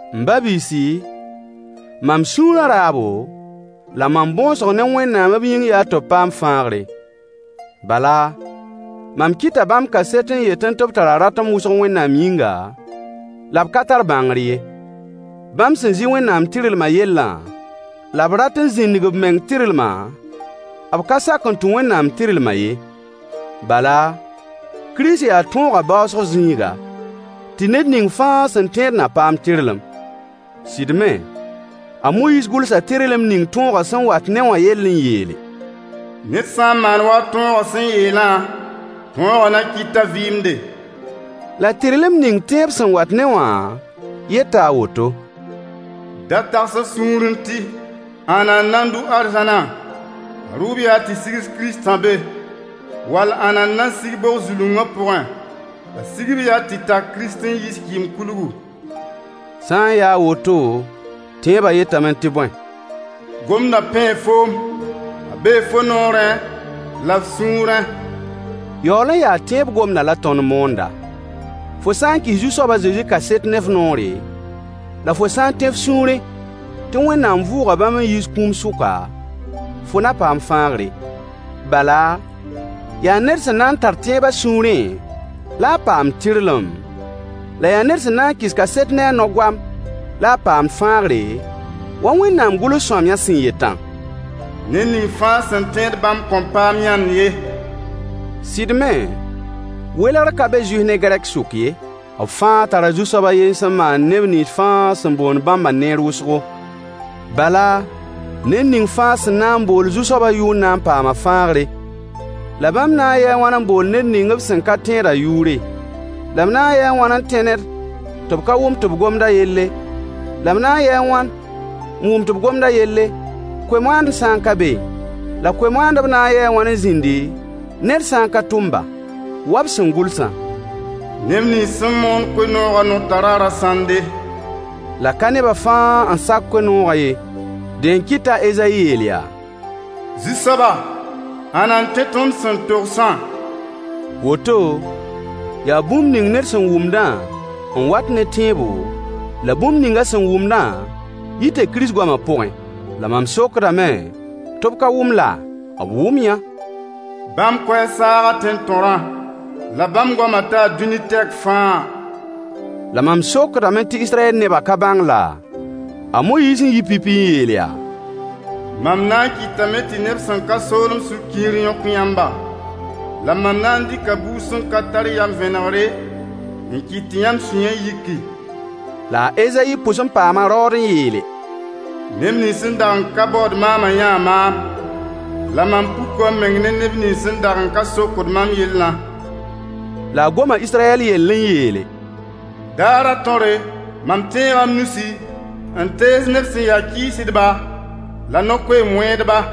M ba-biisi, mam sũurã raabo, la mam bõosg ne Wẽnnaam b yĩng yaa tɩ b paam fãagre. Bala, mam kɩta bãmb kaset n yetẽ tɩ b tara ratem wʋsg Wẽnnaam yĩnga, la b ka tar bãngr ye. Bãmb sẽn zɩ Wẽnnaam tɩrlmã yellã, la b rat n zĩndig b meng tɩrlmã, b ka sak n tũ Wẽnnaam tɩrlmã ye. Bala, Kirist yaa tõogã baoosg zĩiga, tɩ ned ning fãa sẽn tẽed na paam tɩrlem. Sɩd me, a Moyiis gʋlsa tɩrlem ning tõogã sẽn wat-ne wã yell n yeele: Ned sã n maan wa tõogã sẽn yeelã, tõogã na kɩt t'a vɩɩmde. La tɩrlem ning tẽeb sẽn wat-ne wã yeta a woto: Da tags f sũurẽ tɩ: Ãnna n na n dʋ arzãna? A rʋʋb yaa tɩ sigs Kiristã be. Wall ãnna n na n sig bog-zulungã pʋgẽ? A sigb yaa tɩ tak Kirist n yiis kɩɩm-kulgu. Sã n yaa a woto, tẽebã yetame tɩ bõe? Gomdã pẽe foom, a bee fo noorẽ la f sũurẽ. Yaool n yaa tẽeb gomdã la tõnd moonda. Fo sã n kɩs Zu-soab a Zezi kaset ne f noore, la fo sã n tẽ f sũurẽ tɩ Wẽnnaam vʋʋga bãmb n yiis kũum sʋka, fo na paam fãagre. Bala, yaa ned sẽn na n tar tẽeb a sũurẽ la a paamd tɩrlem, la yaa ned sẽn na n kɩs kaset ne a no-goam la a paamd fãagre, wa Wẽnnaam gʋls-sõamyã sẽn yetã: Ned ning fãa sẽn tẽed bãmb kõn paam yãnd ye. Sɩd me, welgr ka be Zuif ne Gɛrk sʋk ye: B fãa tara Zu-soab a yen sẽn maand neb nins fãa sẽn boond bãmbã neer wʋsgo. Bala, ned ning fãa sẽn na n bool Zu-soabã yʋʋr na n paama fãagre. La bãmb na n yɩɩ a wãn n bool ned ning b sẽn ka tẽedã yʋʋre? La b na n yɩɩ a wãn n tẽ ned tɩ b ka wʋm tɩ b gomd a yelle? La b na n yɩɩ a wãn n wʋm tɩ b gomd a yelle, koe-moaandb sã n ka beẽ? La koe-moaandb na n yɩɩ wãn n zĩndi, ned sã n ka tʋm-ba? Wa b sẽn gʋlsã: Neb nins sẽn moond koe-noogã nao tara rasãnde. La ka nebã fãa n sak koe-noogã ye. Dẽ n kɩt t'a Ezayi yeel yaa: Zu-soaba, ãnna n tẽ tõnd sẽn togsã? Woto, yaa bũmb ning ned sẽn wʋmdã n wat ne tẽebo, la bũmb ning a sẽn wʋmdã yita Kirist goamã pʋgẽ. La mam sokdame tɩ b ka wʋm laa? B wʋm-yã! Bãmb koɛɛg saaga tẽn-tõrã, la bãmb goamã taa dũni tɛk fãa. La mam sokdame tɩ Israyɛl nebã ka bãng laa? A Moyiis n yɩ pipi n yeel yaa: Mam na n kɩtame tɩ neb sẽn ka soolem sũ-kiir yõk yãmba, la mam na n dɩka buud sẽn ka tar yam vẽnegre, n kɩt tɩ yãmb sũyã yiki. La a Ezayi pʋs n paama raood n yeele: Neb nins sẽn dag n ka baood maamã yãa maam. La mam puka m meng ne neb nins sẽn dag n ka sokd mam yellã. La a goma Israyɛl yell n yeele: Daarã tõre, mam tẽega m nusi, n tees neb sẽn ya kɩɩsdba, la no-koeem wẽedba.